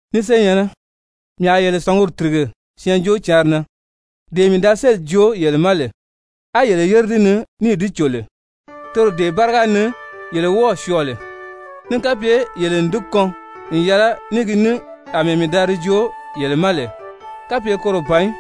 Ni senyɛ̀nnɛ, mii a yele sɔ̀ngumi tìrige Syɛɛnjóocǎnri na, dee mii da sélì joo yele ma lè, á yele yére di ni níì di cò lè, toro dee báriga ni yele wɔ́ɔ̀ syɔɔ lè, ní kapye yele n di kɔn n yɛlɛ ní gi ní àmɛɛ mii da di joo yele ma lè. Kapye koro ban í,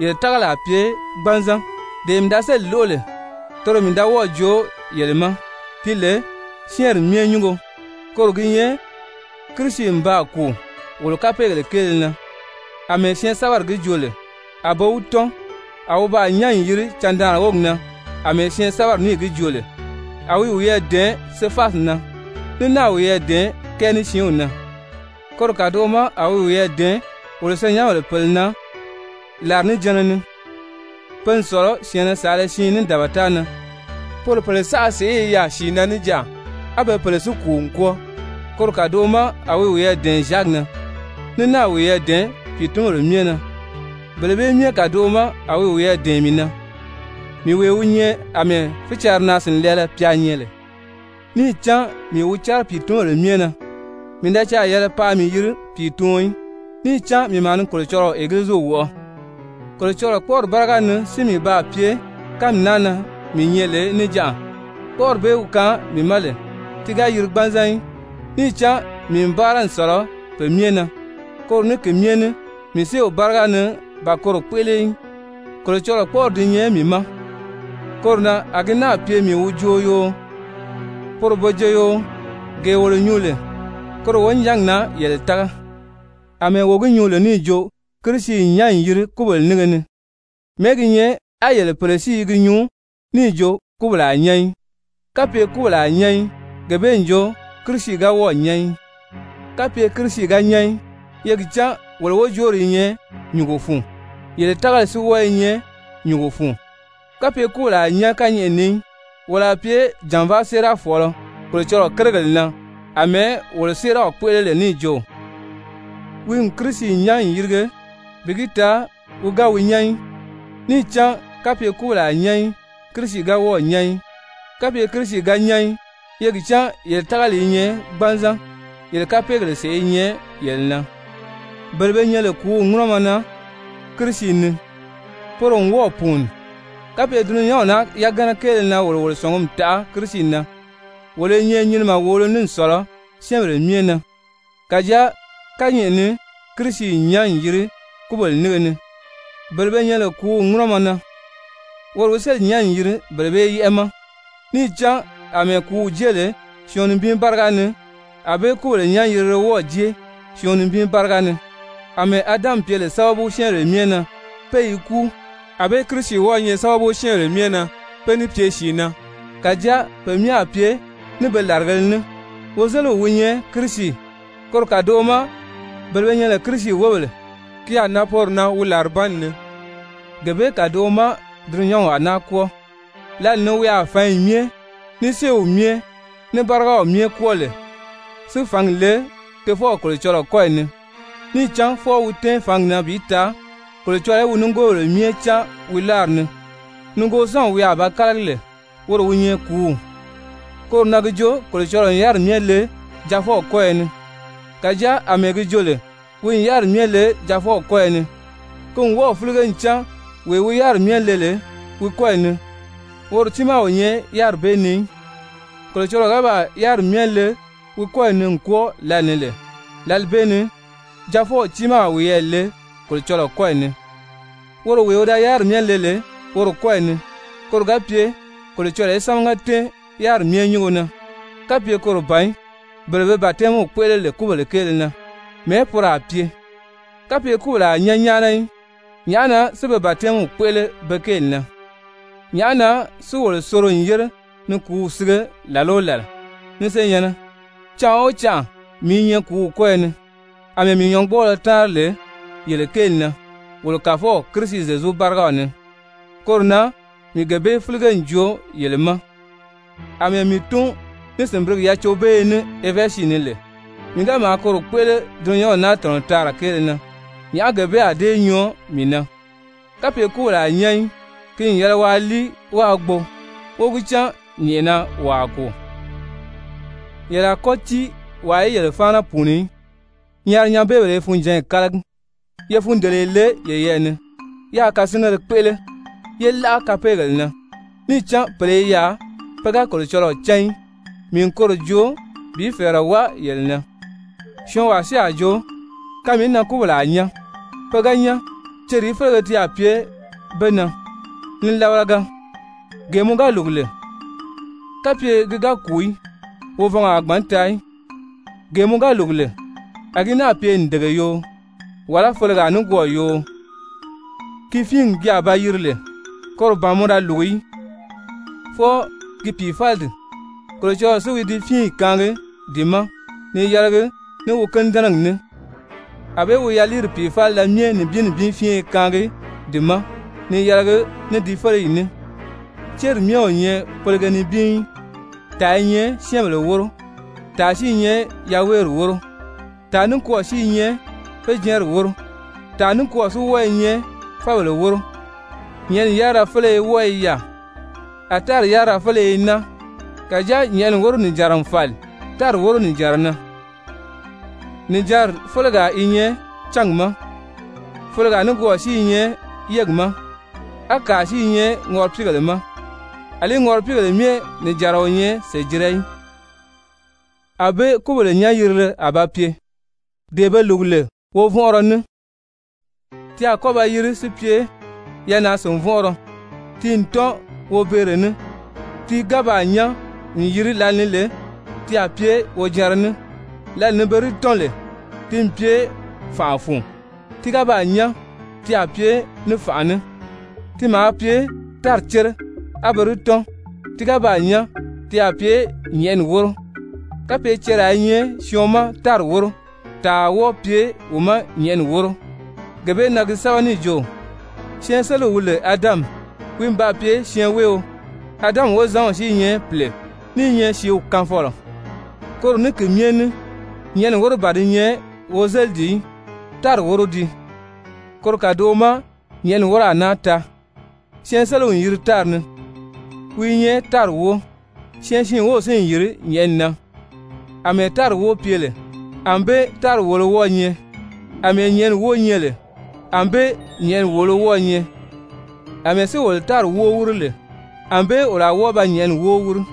yele tágali a pye gbanzan. Dee mii da sélì lóʔo lè, toro mii da wɔ́ɔ̀ joo yele ma ti lè syɛ́ɛnri myɛ nyúngo. Koro gi nyɛ Kirisi n baa kùu wolo kapeegèle kéele na, àmɛɛ Syɛɛnsɛbɛri gi joo lè. A be wi tɔ́n, a wi baa nyán n yìri candaanri wógi na àmɛɛ Syɛɛnsɛbɛri níì gi joo lè, a wi wiyɛɛ dɛ̀ɛn Sefasi na, ní náà wiyɛɛ dɛ̀ɛn kɛɛ ní siinw na. Koro kàdoʔo ma a wi wiyɛɛ dɛ̀ɛn wolo senyɛnbèle pèle na làrinijanna ni, pe n sɔ̀lɔ syɛ̀ɛnnɛ saala siin ní dabata na. Poro pèle saʔa sèʔé i yaà sìi na níjanʔa, á be pèle si kùu n kwɔ́ɔ. Koro kàdoʔo ma a wi wiyɛɛ dɛ̀ɛn Zyaki na, ní náà wiyɛɛ dɛ̀ɛn pìitunbèle myɛ na. Bele bee myɛ kàdoʔo ma, a wi wiyɛɛ dɛ̀ɛn mii na, mii wee wi nyɛ àmɛɛ fícarinaa-sìnlɛɛlɛ pya nyɛ lè. Níì cán mii wi cɛ́rɛ pìitunbèle myɛ na, mii da caà yɛlɛ paa mii yiri pìituɔn í, níì cán mii maa ni Kolocɔlɔɔ Egiliziw wɔʔɔ. Kolocɔlɔɔ kpɔ́ʔɔri báriga ni si mii baa pye kánmi naa na mii nyɛ lè níjanʔa, kpɔ́ʔɔri bee wi kaan mii ma lè, ti ga yiri gbanzan í. Níì cán mii n báara n sɔ̀lɔ pe myɛ na. Koro ní ki myɛ ní mii séew báriga ni ban koro kpéʔele í, Kolocɔlɔɔ kpɔ́ʔɔri di nyɛ mii ma. Koro na a gi náà pye mii wi joo yoo, poro be joo yoo, gee wolo nyuu lè, koro wonijangi na yele tága. Amɛɛ wo gi nyuu lè níì jo Kirisi n nyán n yiri kúbèle nínge ni, mɛ̀ɛ́ gi nyɛ á yele pèle si i gi nyuu níì jo kúbèle a nyán í. Kapye kúbèle a nyán í, gee bee n jo Kirisi ga wɔ́ɔ̀ nyán í. Kapye Kirisi ga nyán í, ye gi cán wolo wojoori i nyɛ nyùngo fun, yele tágali si wɔ́ɔ i nyɛ nyùngo fun. Kapye kúbèle a nyán kányɛʔɛ ni í, wolo a pye jànvaa séerafɔɔlɔ Kolocɔlɔɔ kérigèle na àmɛɛ wolo séeraw kpéʔele lè níì jo, wi n Kirisi nyán n yìrige bi gi taa wi ga wi nyán í. Níì cán kapye kúbèle a nyán í, Kirisi ga wɔ́ɔ̀ nyán í. Kapye Kirisi ga nyán í, ye gi cán yele tágali i nyɛ gbanzan. Yele kapeegèle sèʔé i nyɛ yele na, bele be nyɛ lè kùúw ŋúnɔmɔ na Kirisi ni, poro n wɔ́ɔ̀ pùuni. Kapye dulunyanw naa yagana kéele na wolo wolo sɔ̀ngumi taʔa Kirisi na, wolo i nyɛ nyinimɛ wòolo ní n sɔ̀lɔ syɛ́ɛnbèle myɛ na. Kàjáa kányɛʔɛ ni Kirisi n nyán n yiri kúbèle nínge ni, bele be nyɛ lè kùúw ŋúnɔmɔ na, woro wi sélì nyán n yiri bele bee yɛ́ʔɛ ma. Níì cán àmɛɛ kùúw jée lè syɔɔn nibin báriga ni, ànbée kúbèle nyán-yirile wɔ́ɔ̀ jée syɔɔn nibin báriga ni. Amɛɛ Adami pye lè sábabu syɛ́ɛnbèle myɛ na pé i kúu, ànbée Kirisi wɔ́ɔ̄ nyɛ sábabu syɛ́ɛnbèle myɛ na pé ní pye sìi na. Kàjáa pe myɛ a pye ní be làrigēle ní, wozeliw wi nyɛ Kirisi, koro kàdoʔo ma bele be nyɛ lè Kirisi wóbèle, ki a nan poro na wi làribanni ni. Gee bee kàdoʔo ma dulunyanw a náa kwɔ́ɔ, Lǎli ni wi a fǎnyi myɛ, ní séew myɛ, ní bárigaw myɛ kwɔ́ɔ lè si fǎngi le Tofɔw Kolocɔlɔɔ kɔ́yi ni. Níì cán fwɔɔ wi tɛ́ɛn fǎngi na bi taa Kolocɔlɔɔ í wi nigoobèle myɛ cáan wi láari ni. Nigoosanw wi a ba kálagi lè, woro wi nyɛ kùúw. Koro na gi jo Kolocɔlɔɔ n yáriri myɛ le Jaafɔw kɔ́yɔ ni. Kàjáa àmɛɛ gi jo lè wi n yáriri myɛ le Jaafɔw kɔ́yɔ ni, ki n wɔ́ɔ̀ fílige ncan wee wi yáriri myɛ le lè wi kɔ́yi ni, woro tiimaa o nyɛ yáriri bee ni í. Kolocɔlɔɔ ga baa yáriri myɛ le wi kɔ́yi ni n kwɔ́ɔ lǎlee ni lè, lǎli bee ni Jaafɔw tiimaa a wiyɛɛ le Kolocɔlɔɔ kɔ́yi ni woro wee wi da yáriri myɛ le lè woro kɔ́yi ni, koro ga pye Kolocɔlɔɔ í sámaga tɛ́ɛn yáriri myɛ nyúngo na. Kapye koro ban í, bele be batɛmiw kpéʔele lè kúbèle kéele na, mɛ̀ɛ́ poro a pye? Kapye kúbèle a nyán nyáana í, nyàʔá na si be batɛmiw kpéʔele be kéeli na? Nyàʔá na si wolo soro n yére ni kùúw sige làla o làla? Ni senyɛ̀nnɛ, canʔa o canʔa mii i nyɛ kùúw kɔ́yɔ ni. Amɛɛ mii nyɔ̌ngbɔɔlɔ táanri lè yele kéeli na wolo Kàfɔw Kirisi Zyezu bárigaw ni, koro na mii gee bee fílige n joo yele ma. Amɛɛ mii tún ní sìnbirigi yacobeeye ní Efɛzi ni lè, mii ga maa koro kpéʔele dulunyanw naa tɔ̀nɔ taara kéele na, nyàʔá gee bee a dée nyɔɔ mii na? Kapye kúbèle a nyán í, «ki n yɛlɛ waa líi wáā gbo wó gi cán nyɛ̀ʔɛna wo a kùu.» Yele a kɔ́ tíi wàa í yele fáana pùuni í, nyaarinyɛnbeebèle i funjǎnyi kálagi. Ye fundeleye le yeyɛɛ ni, yáā kasingéle kpéʔele, yé láʔa kapeegèle na. Níì cán pèle i yaà pe ga Kolocɔlɔɔ cán í, mii n koro joo bi fɛ̀ɛrɛ wáa yele na. Syɔɔnwaa si a jo: «Kanmìí na kúbèle a nyán? Pe ga nyán cerìí félege ti a pye be na?» Nilabalaga! Gee mɔ ga lùgu lè, kapye ki ga kùu í, wovɔngɔ a gbǎn taa í. Gee mɔ ga lùgu lè, a gi náà pye ǹdege yoo, wàlá felegaa nikwɔɔ yoo, ki fíingi ki a ba yiri lè, koro ban mɔ da lùgu í, fwɔɔ ki pìifalidi. Kolocɔlɔɔ si wi di fíinyi kaangi di ma ni yɛlɛgi ní wi kínidɛnɛgi ní, ànbée wi yaliiri pìifalida myɛ nibin nibin fíinye kaangi di ma ni yɛlɛgi ní di féleyi ní. Céri myɛ o nyɛ felege nibin í. Tàa i nyɛ syɛ́ɛnbèle wóro, tàa si i nyɛ yaweeri wóro, tàa nikwɔɔ si i nyɛ féjɛɛnri wóro, tàa nikwɔɔ si wɔ́ɔ i nyɛ fábèle wóro. Nyɛ̀ʔɛni yárira féleye wɔ́ɔ i yaà, a tári yárira féleye i naa. Kàjáa nyɛ̀ʔɛni wóro nìjanra n fàli tári wóro nìjanra na. Nìjanri félegaa i nyɛ cángi ma, felegaa nikwɔɔ si i nyɛ yégi ma, á kàa si i nyɛ ŋɔripiigèle ma. Alí ŋɔripiigèle myɛ nìjanra o nyɛ sèjira í. Anbée kúbèle nyán-yirile a ba pye. Dee be lùgu lè wovɔnʔɔrɔ ní, ti a kɔ́ ba yiri si pye yanaa-sìnvɔnʔɔrɔ. Ti n tɔ́n wobeere ní, ti ga baa nyán n yiri lǎli ni lè, ti a pye wojanra ní. Lǎli ni pe di tɔ́n lè, ti n pye fànʔa fun. Ti ga baa nyán, ti a pye ní fànʔa ní. Ti maa pye tári cére á be di tɔ́n, ti ga baa nyán, ti a pye nyɛ̀ʔɛni wóro. Kapye ceraa i nyɛ syɔɔn ma tári wóro, tàa a wɔ́ɔ pye wi ma nyɛ̀ʔɛni wóro. Gee bee na gi sɛ́bɛ níì jo: «Syɛɛnseliw wi lè Adami, wi n baa pye syɛɛnweeo,» Adami wozanw si i nyɛ pìle, ní i nyɛ sìíw kaanfɔlɔ. Koro ní ki myɛ ní nyɛ̀ʔɛni wóro ban di nyɛ wozelidi í, tári wóro dii. Koro kàdoʔo ma nyɛ̀ʔɛni wóro a náa taa. Syɛɛnseliw n yiri tári ni, wi i nyɛ tári wóo. Syɛɛnsiin wów si n yìri nyɛ̀ʔɛni na. Amɛɛ tári wóo pye lè, ànbée tári wòolo wɔ́ɔ̄ nyɛ. Amɛɛ nyɛ̀ʔɛni wóo nyɛ lè, ànbée nyɛ̀ʔɛni wòolo wɔ́ɔ̄ nyɛ. Amɛɛ si wolo tári wóo wíri lè, ànbée wolo a wɔ́ɔ ba nyɛ̀ʔɛni wóo wíri.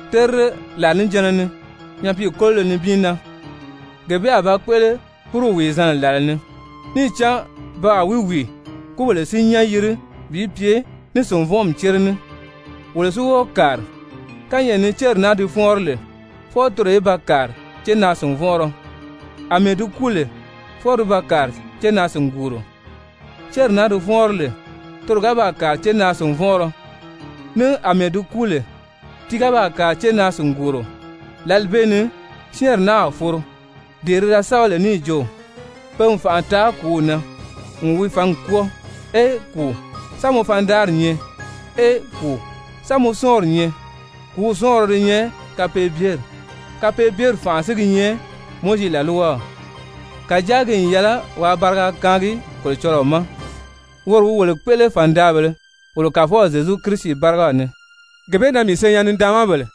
terire làrinijanna ni, nyapiikololo nibin na, gee bee a ba kpéʔele búruw wìizanna làla ni. Níì cán pe a wi wìi, kúbèle si nyán yiri bi pye ní sìnvɔnʔɔmi cére ní, wolo si wɔ́ɔ kàri. Kányɛʔɛ ni céri naa di fɔ́ɔnri lè, fwɔɔ toro í ba kàri cénaa-sìnvɔnʔɔrɔ, àmɛɛ di kúu lè, fwɔɔ ti ba kàri cénaa-sìnguuro. Céri naa di fɔ́ɔnri lè, toro ga baa kàri cénaa-sìnvɔnʔɔrɔ, ní àmɛɛ di kúu lè, ti ga baa kàri cénaa-sìnguuro, lǎli bee ni syɛ́ɛnri naa a foro dee ti da sɛ́bɛ lè níì jo: «Pe n fànʔa taa kùúw na n wi fǎngi kwɔ́ɔ.» «Ee kùu, sán mɔ fandaari nyɛ? Ee kùu, sán mɔ sɔ́ɔnri nyɛ?» Kùúw sɔ́ɔnrɔ di nyɛ kapeebyeri. Kapeebyeri fànʔa si gi nyɛ Mowizi làlwaw. Kàjáa ki n yɛlɛ waa bariga kaangi Kolocɔlɔɔ ma, woro wi wolo kpéʔele fàndaabèlē wolo Kàfɔw Zyezu Kirisi bárigaw ni. Gee bee na, mii senyɛn-nidaanmabèle,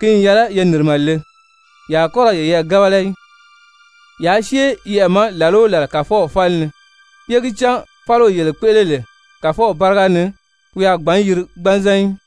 ki n yɛlɛ ye nìrimɛ le, ye a kɔ́ ra yeyɛɛ gábala í, yaa syée yɛʔɛ ma làla o làla Kàfɔw fáli ni, ye gi cán fáliwee yele kpéʔele lè Kàfɔw báriga ni, wi a gbǎn yiri gbanzan í.